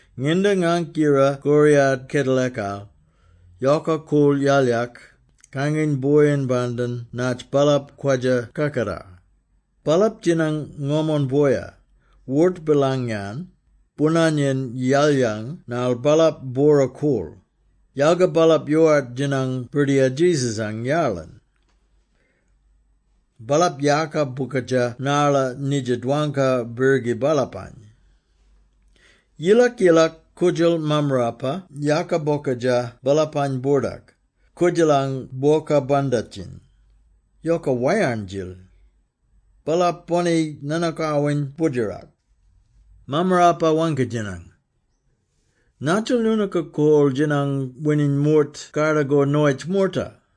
Nginda ngank yira koriyat kedelakal, yoka koorl yalyak, kanginy boyin-bandin natj baalap kwadja kakatar. Baalap djinang ngomon boya, wort-bilang-yan boonanyen yalyang ngarl baalap bwora-koorl; yalga baalap yoowart djinang Birdiyar Jesus-ang yarlin. Baalap yaaka bokadja narla nidja dwangka-birgi baalapany. Yilak-yilak koodjal mammarapa yaaka bokadja baalapany-boordak, koodjalang bwoka bandatjiny. Yoka wayarn-djil. Baalap boni-nanookawin boodjerak. Mammarapa waangki-djinang, “Nadjil noonooka korl-djinang wininy moort kardakor noyitj moorta?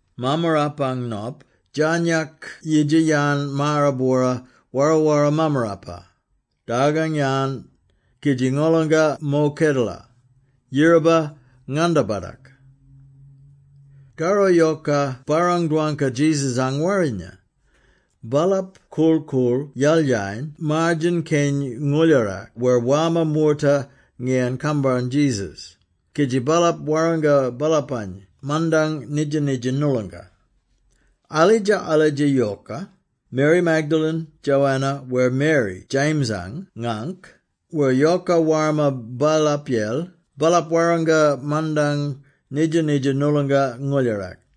‘Mammarapang Nop djarnyak yidja-yan maara-bwora wara-wara mammarapa, dargang-yan, kidji ngolonga mo kedela, yiraba ngandabatak.’” Karro yoka barrang-dwangka Jesus-ang warrinya. Baalap korl-koorl yalyayen maar-djen-keny ngooldjarak wer warma moorta ngiyan kambarn Jesus, kidji baalap warranga baalapany mandang nidja-nidja noolonga. Alidja-alidja yoka, Mary Magdalene, Joanna, wer Mary James-ang ngaangk, wer yoka warma baalapyel, baalap warranga mandang nidja-nidja noolonga ngooldjarak.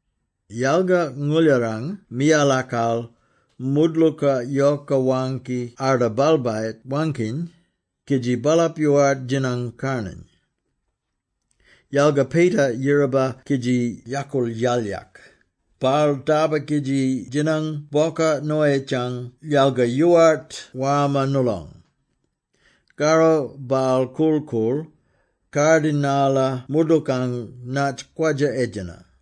Yalga ngooldjarang miyalakal, moodlooka yoka waangki arda balbayit-waangkiny, kidji baalap yoowart djinang karnany. Yalga Peter yiraba kidji yakoorl yalyak; baal darba kidji djinang bwoka noyitjang yalga yoowart warma noolong. Karro baal korl-koorl, kardi narla moodlookang natj kwadja-edjena.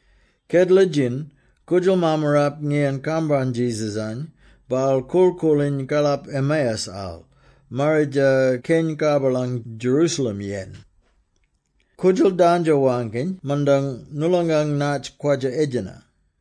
Kedela-djin, koodjal mammarap ngiyan kambarn Jesus-any, baal korl-koorliny karlap Emmaus-al, marridja keny karbalang Jerusalem-yen. Koodjal dandjo-waangkiny mandang noolongang natj kwadja-edjena.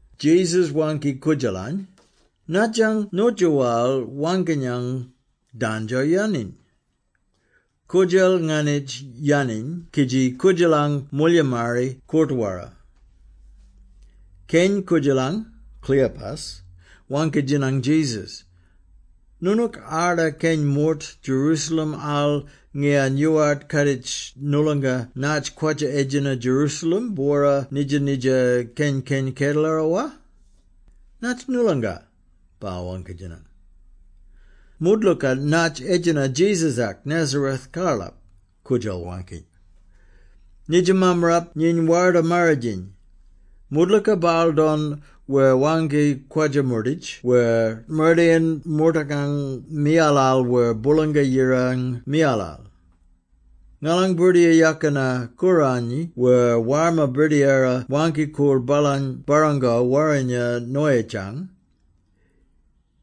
Jesus waangki koodjalany, “Nadjang nyootjoowal waangkinyang, dandjo-yaniny?” Koodjal nganitj yaniny kidji koodjalang moolyimari koort-wara. Keny koodjalang, Cleopas, waangki-djinang Jesus, “Noonook arda keny moort Jerusalem-al ngiyan yoowart kaaditj noolonga natj kwadja-edjena Jerusalem-bwora nidja-nidja keny-keny kedelara, wa?” “Natj noolonga?” baal waangki-djinang. “Moodlooka natj edjena Jesus-ak Nazareth-karlap,” koodjal waangki. “Nidja mammarap nyiny Warda-Marridjiny. Moodlooka baal don wer waangki kwadja-moorditj wer mardayin moortakang miyalal wer Boolanga-Yirang miyalal. Ngalang Birdiyara Yakina-Koorany wer warma birdiyara waangki-koorl baalany barrango warrinya noyitjang,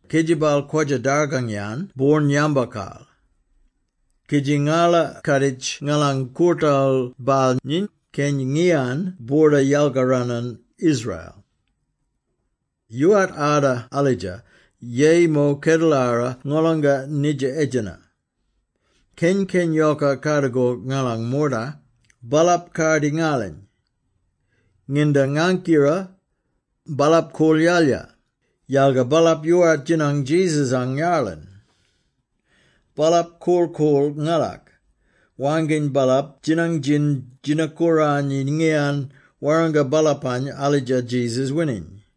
kidji baal kwadja-dargang-yan boorn-yambokal. Kidji ngala kaaditj ngalang koortal baal nyiny Keny ngiyan boorda yalkaranan Israel! “Yoowart arda alidja, yeyi mo kedelara ngolonga nidja edjena, keny-keny yoka kardakor ngalang moorta, baalap kardi ngalany. Nginda ngank yira, baalap koorl yalya, yalga baalap yoowart djinang Jesus-ang yarlin. Baalap korl-koorl ngalak, waangkiny baalap djinang djin-djina-kooranyi ngiyan warranga baalapany alidja Jesus wininy!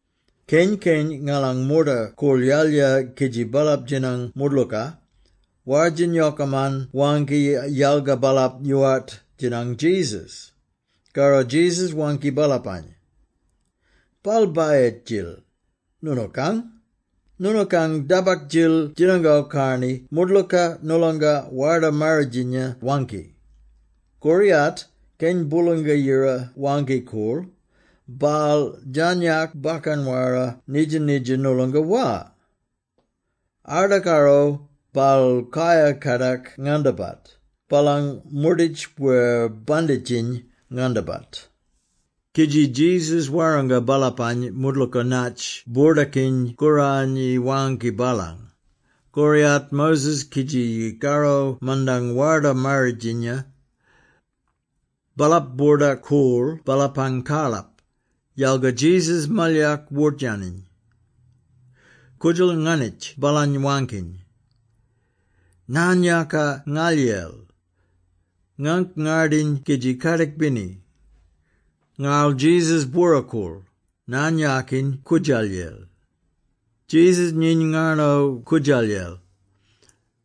Keny-keny ngalang moorta koorl yalya kidji baalap djinang moodlooka, war-djin yokaman waangki, yalga baalap yoowart djinang Jesus.” Karro Jesus waangki baalapany, “Balbayit-djil noonookang! Noonookang dabak-djil djinango-karni moodlooka, noolonga Warda-Marridjinya waangki! Koriyat, Keny Boolanga-Yira Waangki-Koorl, baal djarnyak bakkan-wara nidja-nidja noolonga, wa? Arda karro, baal kayar-kadak ngandabat, baalang moorditj wer banditjiny ngandabat.” Kidji Jesus warranga baalapany moodlooka natj Boordakiny-Kooranyi waangki baalang, koriyat Moses kidji karro mandang Warda-Marridjinya. Baalap boordak-koorl baalapang karlap, yalga Jesus malyak wort-yaniny. Koodjal nganitj baalany, waangkiny, “Naan-yaaka ngalyel! Ngangk ngardiny kidji kadik-bini.” Ngarl Jesus bwora-koorl, naan-yaakiny koodjalyel. Jesus nyiny ngarno koodjalyel.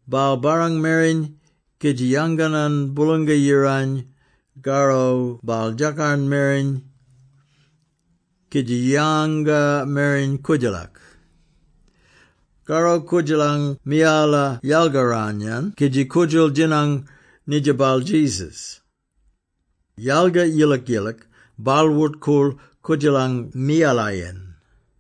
Baal barrang mereny, kidji yanganan Boolang-Yirany, karro baal djakarn mereny kidji yanga mereny koodjalak. Karro koodjalang miyala yalgaran-yan kidji koodjal djinang nidja baal Jesus. Yalga yilak-yilak, baal wort-koorl koodjalang miyalayen.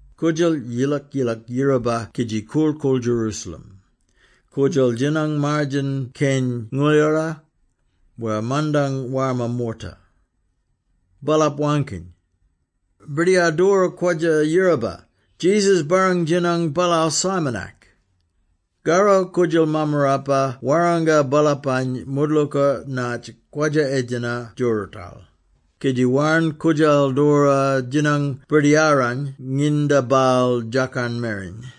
Koodjal yilak-yilak yiraba kidji korl-koorl Jerusalem. Koodjal djinang maar-djen-keny ngooljdara, wer mandang warma moorta. Baalap waangkiny, “Birdiyar doora kwadja-yiraba! Jesus barrang-djinang baalaal Simon-ak!” Karro koodjal mammarapa warranga baalapany moodlooka natj kwadja-edjena djoorootal, kidji yarn koodjal doora djinang Birdiyarany nginda baal djakarn mereny.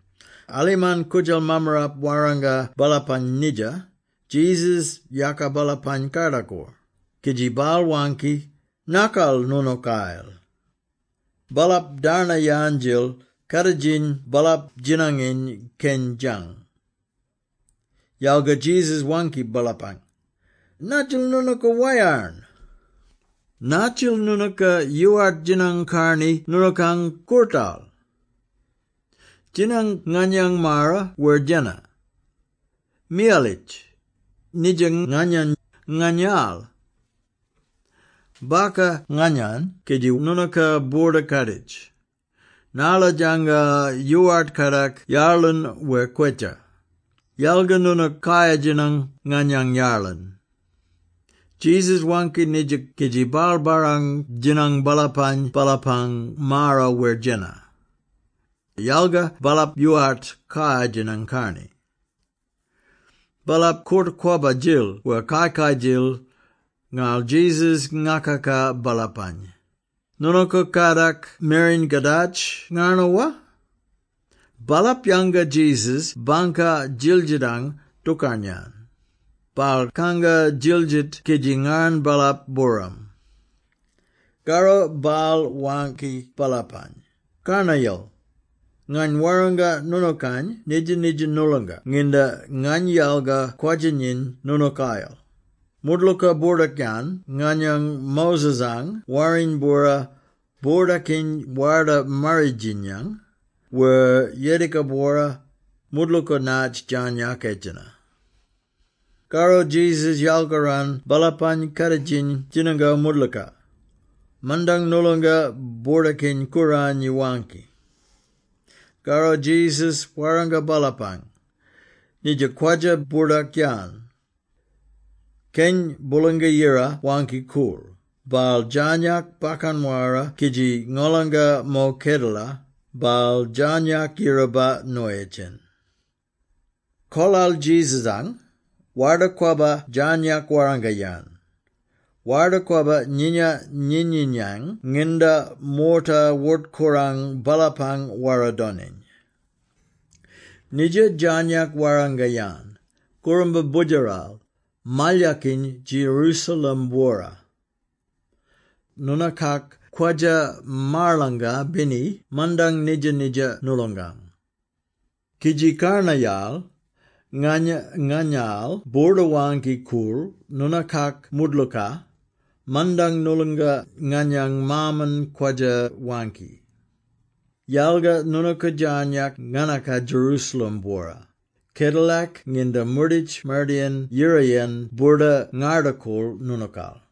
Alimarn koodjal mammarap warranga baalapany nidja, Jesus yaaka baalapany kardakor, kidji baal waangki, “Nakal noonookayel!” Baalap darnayan-djil, kaaditjiny baalap djinanginy keny djang. Yalga Jesus waangki baalapany, “Naadjil noonooka wayarn? Nadjil noonooka yoowart djinang-karni noonookang koortal? Djinang nganyang maara wer djena. Miyalitj! Nidja nganyany, nganyaal! Baka nganyany, kidji noonooka boorda-kaaditj, narla djanga yoowart kadak yarlin wer kwetja, yalga noonook kayar-djinang nganyang yarlin!” Jesus waangki nidja kidji baal barrang-djinang baalapany baalapang maara wer djena. Yalga baalap yoowart kayar-djinang-karni. Baalap koort-kwabba-djil wer kai-kai-djil; ngarl Jesus ngakaka baalapany, “Noonooka kadak mereny ka djaadj ngarno, wa?” Baalap yanga Jesus bangka djildjitang dookarn-yan. Baal kanga djildjit kidji ngarn baalap-booram. Karro baal waangki baalapany, “Karnayal, ngany warranga noonookany nidja-nidja noolonga nginda ngany yalga kwadja-nyiny noonookayel: moodlooka boordak-yan nganyang Moses-ang Warriny-bwora, boordakiny Warda-Marridjinyang, wer Yediga-bwora; moodlooka natj djarnyak edjena.” Karro Jesus yalkaran baalapang kaaditjiny djinango moodlooka, mandang noolonga Boordakiny-Kooranyi waangki. Karro Jesus warranga baalapany, “Nidja kwadja-boordak-yan: ‘Keny Boolanga-Yira Waangki-Koorl, baal djarnyak bakkan-wara kidji ngolanga mo kedela, baal djarnyak yiraba noyitjyen.’ Kolal Jesus-ang, Warda-Kwabba djarnyak warranga-yan, Warda-Kwabba nyinya-nyinyinyang nginda moorta wort-korang baalapang wara-doniny. Nidja djarnyak warranga-yan, kooramba Boodjaral, malyakiny Jerusalem-bwora. Noonooka kwadja-marlanga-bini mandang nidja-nidja noolongang. Kidji karnayal, ngany nganyaal boorda-waangki-koorl noonookak moodlooka, mandang noolonga nganyang Maaman kwadja-waangki. Yalga noonooka djarnyak nganaka Jerusalem-bwora, kedalak nginda moorditj mardayin yirayen boorda ngarda-koorl noonookal.”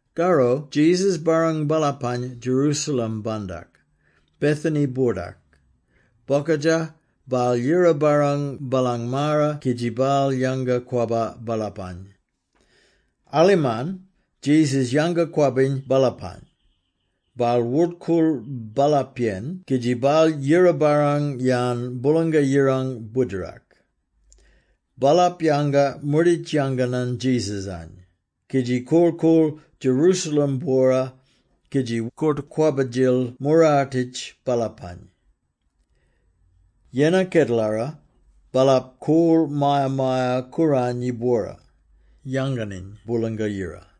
Karro Jesus barrang baalapany Jerusalem-bandak, Bethany-boordak. Bokadja, baal yira-barrang baalang maara kidji baal yanga-kwabba baalapany. Alimarn Jesus yanga-kwabbiny baalapany, baal wort-koorl baalapyen kidji baal yira-barrang-yan Boolanga-Yirang Boodjerak. Baalap yanga moorditj yanganan Jesus-any, kidji korl-koorl Jerusalem-bwora, kidji koort-kwabba-djil moorartitj baalapany. Yennar kedelara, baalap koorl Maya-maya-Kooranyi-bwora, yanganiny Boolanga-Yira.